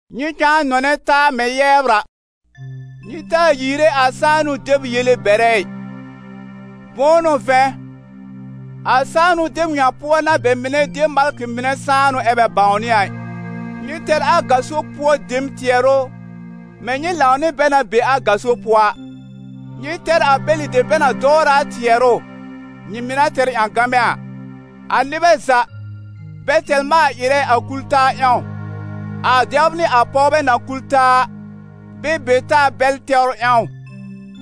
Nyɩ cãa nɔnɛ taa mɛ̃ yɛbr a. Nyɩ taa yiire a sãanʋ deb yele bɛrɛ ɩ. Bʋ̃ʋ n'ʋ vɛ̃, a sãanʋ deb ŋa pʋɔ n'a bɛ mɩnɛ de malkɩ mɩnɛ sãanʋ ɛ bɛ bãwnɩ a ɩ. Nyɩ tɛr a gaso pʋɔ dem tɩɛrʋ mɛ̃ nyɩ lãw nɩ bɛ na be a gaso pʋɔ a; nyɩ tɛr a bɛlɩ dem bɛ na dɔwrɛ a tɩɛrʋ, nyɩ mɩ̀ na tɛr ƴãgamɛ a. A nɩbɛ za, bɛ tɛr maal-ɩrɛ a kul-taa ƴãw, a dɛbr nɩ a pɔwbɛ na kul taa a, bɛ be taa bɛl tɛwr ƴãw.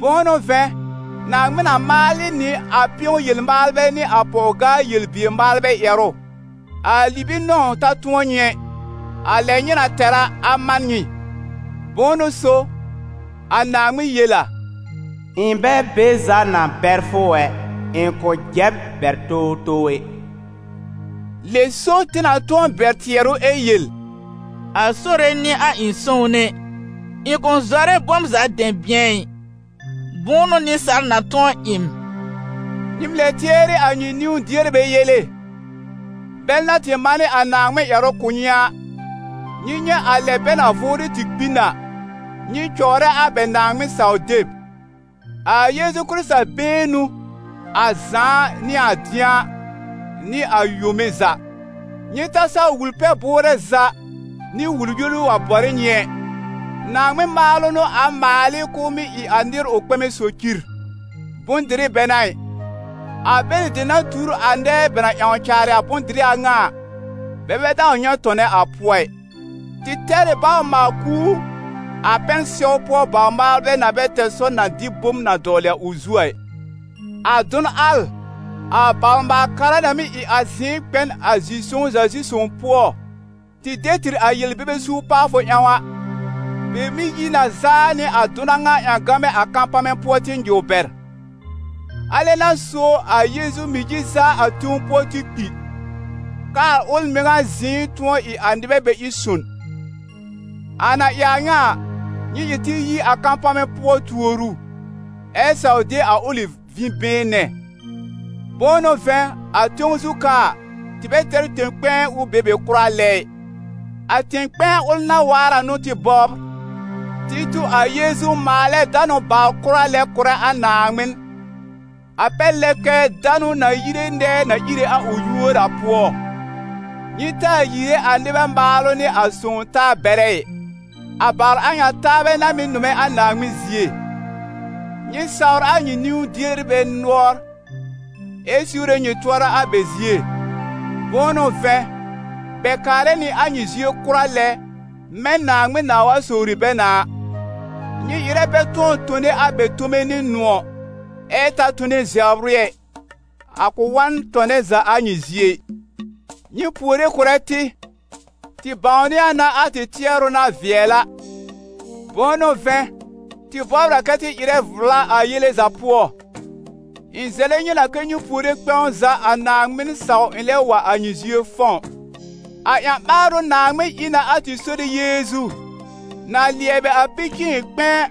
Bʋ̃ʋ n'ʋ vɛ̃, Naaŋmɩn na maal ɩ nɩ a pɩ̃ɔ-yel-maalbɛ nɩ a pɔw-gaa-yel-bier-maalbɛ ƴɛrʋ. A libi-nɔ̃w ta tʋ̃ɔ nyɩ ɛ; a lɛ nyɩ na tɛr a, a man nyɩ. Bʋ̃ʋ n'ʋ so, a Naaŋmɩn yel a: «Ɩ̃ bɛ be za na bɛr fʋ ɛ, ɩ̃ kʋ̃ jɛ b bɛr towtow ɛ.» Lɛ so tɩ na tʋ̃ɔ bɛr tɩɛrʋ ɛ yel: «A Sore n'ɩ a ɩ̃ sõwne, ɩ̃ kʋ̃ zɔrɛ bom za dɛ̃bɩ̃ɛ ɩ. Bʋ̃ʋ n'ʋ nɩsaal na tʋ̃ɔ ɩ m?» Nyɩ lɛb tɩɛrɩ a nyɩ niwn-dierbɛ yele, bɛl na tɩ manɩ a Naaŋmɩn ƴɛrʋ kʋ̀ nyɩ a. Nyɩ nyɛ̃ a lɛ bɛ na vʋʋrɩ tɩ kpi n a, nyɩ cɔwrɛ a bɛ Naaŋmɩn-saw-deb. A Yeezu Kɩrɩta been n'ʋ, a zãa nɩ a dɩ̃a, nɩ a yome za. Nyɩ ta saw wul-pɛ-bʋʋrɛ za nɩ wul-yoru wa bɔr ɩ nyɩ ɛ. Naaŋmɩn maalʋ n'ʋ a maal ɩ k'ʋʋ mɩ́ ɩ a nɩr ʋ kpɛmɛ socir, bʋ̃-dɩrɩ bɛ n'a ɩ; a bɛlɩ dem na tuur a nɛɛ bɛ na ƴãw caarɩ a bʋ̃-dɩrɩ a ŋa a, bɛ bɛ dãw nyɛ̃ tɔnɛ a pʋɔ ɩ. Tɩ tɛr ɩ bawr-maal-kuur, a pɛn-sɛw pʋɔ bawr-maalbɛ na bɛ tɛr sɔr na dɩ bom na dɔwlɩ a ʋ zu a ɩ. A dʋn al, a bawr-maal-kara na mɩ́ ɩ a zɩ̃ɩ kpɛ n a zi-sõw-za-pʋɔ-zi-sõw pʋɔ, tɩ de tɩr a yel-bebe suur pawfʋ ƴãw a, bɛ mɩ́ yi na zaa nɩ a dʋn a ŋa ƴãgamɛ a kapamɛ pʋɔ tɩ nyɩw bɛr. A lɛ n'a so a Yeezu mɩ̀ yi zaa a tẽw pʋɔ tɩ kpi, k'aa ʋl mɩŋa zɩ̃ɩ tʋ̃ɔ ɩ a nɩbɛ bɛ ɩ son. A na ɩ a ŋa a, nyɩ ɩ tɩ yi a kapamɛ pʋɔ tuor ʋ, ɛ saw de a ʋlɩ vĩ-been nɛ. Bʋ̃ʋ n'ʋ vɛ̃, a tẽw zu ka a, tɩ bɛ tɛr tẽ-kpɛ̃ɛ ʋ be be kʋra lɛ ɩ. A tẽ-kpɛ̃ɛ ʋl na waar a n'ʋ tɩ bɔbr. Tɩ tu a Yeezu maalɛ danʋ bawr kʋra lɛ kʋ̀rɛ a Naaŋmɩn, a pɛr lɛ kɛ danʋ na yire nɛɛ na íre a ʋ yúor a pʋɔ. Nyɩ taa yiire a nɩbɛ maalʋ nɩ a sõw-taa bɛrɛ ɩ, a bawr a ŋa taabɛ n'a mɩ́ nʋmɛ a Naaŋmɩn zie. Nyɩ sawr a nyɩ niwn-dierbɛ nʋɔr ɛ siwre nyɩ tʋɔra a bɛ zie. Bʋ̃ʋ n'ʋ vɛ̃, bɛ kaarɛ nɩ a nyɩ zie kʋra lɛ, mɛ̃ Naaŋmɩn nãa wa sowri bɛ na a. Nyɩ ɩrɛ bɛ tʋ̃ɔ tone a bɛ tome nɩ nʋ̃ɔ̀, ɛ ta tone zɛbr ɩ ɛ, a kʋ̃ wa n tɔnɛ za a nyɩ zie ɩ. Nyɩ puore kʋ̀rɛ tɩ. Tɩ bãwnɩ a na a tɩ tɩɛrʋ na vɩɛl a, bʋ̃ʋ n'ʋ vɛ̃, tɩ bɔbr a kɛ tɩ ɩrɛ vla a yele za pʋɔ. Ɩ̃ zɛlɛ nyɩ na kɛ́ nyɩ puore kpɛ̃w za, a Naaŋmɩn saw ɩ̃ lɛb wa a nyɩ zie fɔ̃w. A ƴã-ɓaarʋ Naaŋmɩn ɩ na a tɩ Sore Yeezu, na lɩɛbɩ a pi-cɩ̃ɩn-kpɛ̃ɛ,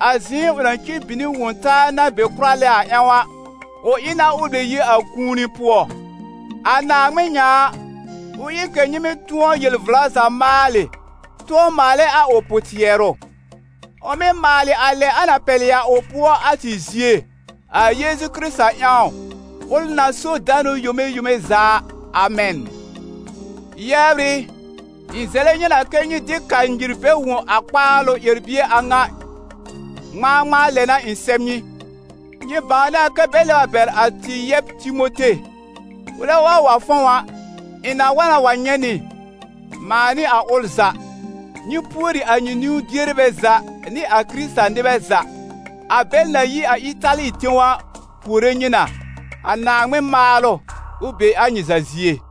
a zɩ̃ɩ ʋ na cir bin nɩ Wõ-taa na be kʋra lɛ a ƴãw a, ʋ ɩ na ʋ lɛb yi a kũuni pʋɔ. A Naaŋmɩn ŋa a, ʋ ɩ kɛ̀ nyɩ mɩ́ tʋ̃ɔ yel-vla za maalɩ, tʋ̃ɔ maalɛ a ʋ pʋ-tɩɛrʋ; ʋ mɩ́ maalɩ a lɛ na pɛlɩ a ʋ pʋɔ a, a tɩ zie, a Yeezu Kɩrɩta ƴãw, ʋl na so danʋ a yome yome za a. Amɛn. Yɛbr ɩ, ɩ̃ zɛlɛ nyɩ na kɛ́ nyɩ dɩ kanyir bɛr wõ a kpaalʋ ƴɛr-bie a ŋa, ŋmãa ŋmãa lɛ n'a ɩ̃ sɛb nyɩ. Nyɩ bãwnɩ a kɛ́ bɛ lɛb a bɛr a tɩ yɛb Timote. Ʋlɛ wa wa fɔ̃w a, ɩ̃ na wa na wa nyɛ̃ nyɩ, mãa nɩ a ʋl za. Nyɩ pùori a nyɩ niwn-dierbɛ za nɩ a Kɩrɩta-nɩbɛ za. A bɛl na yi a Ɩtali tẽw a, puore nyɩ na. A Naaŋmɩn maalʋ, ʋ be a nyɩ za zie!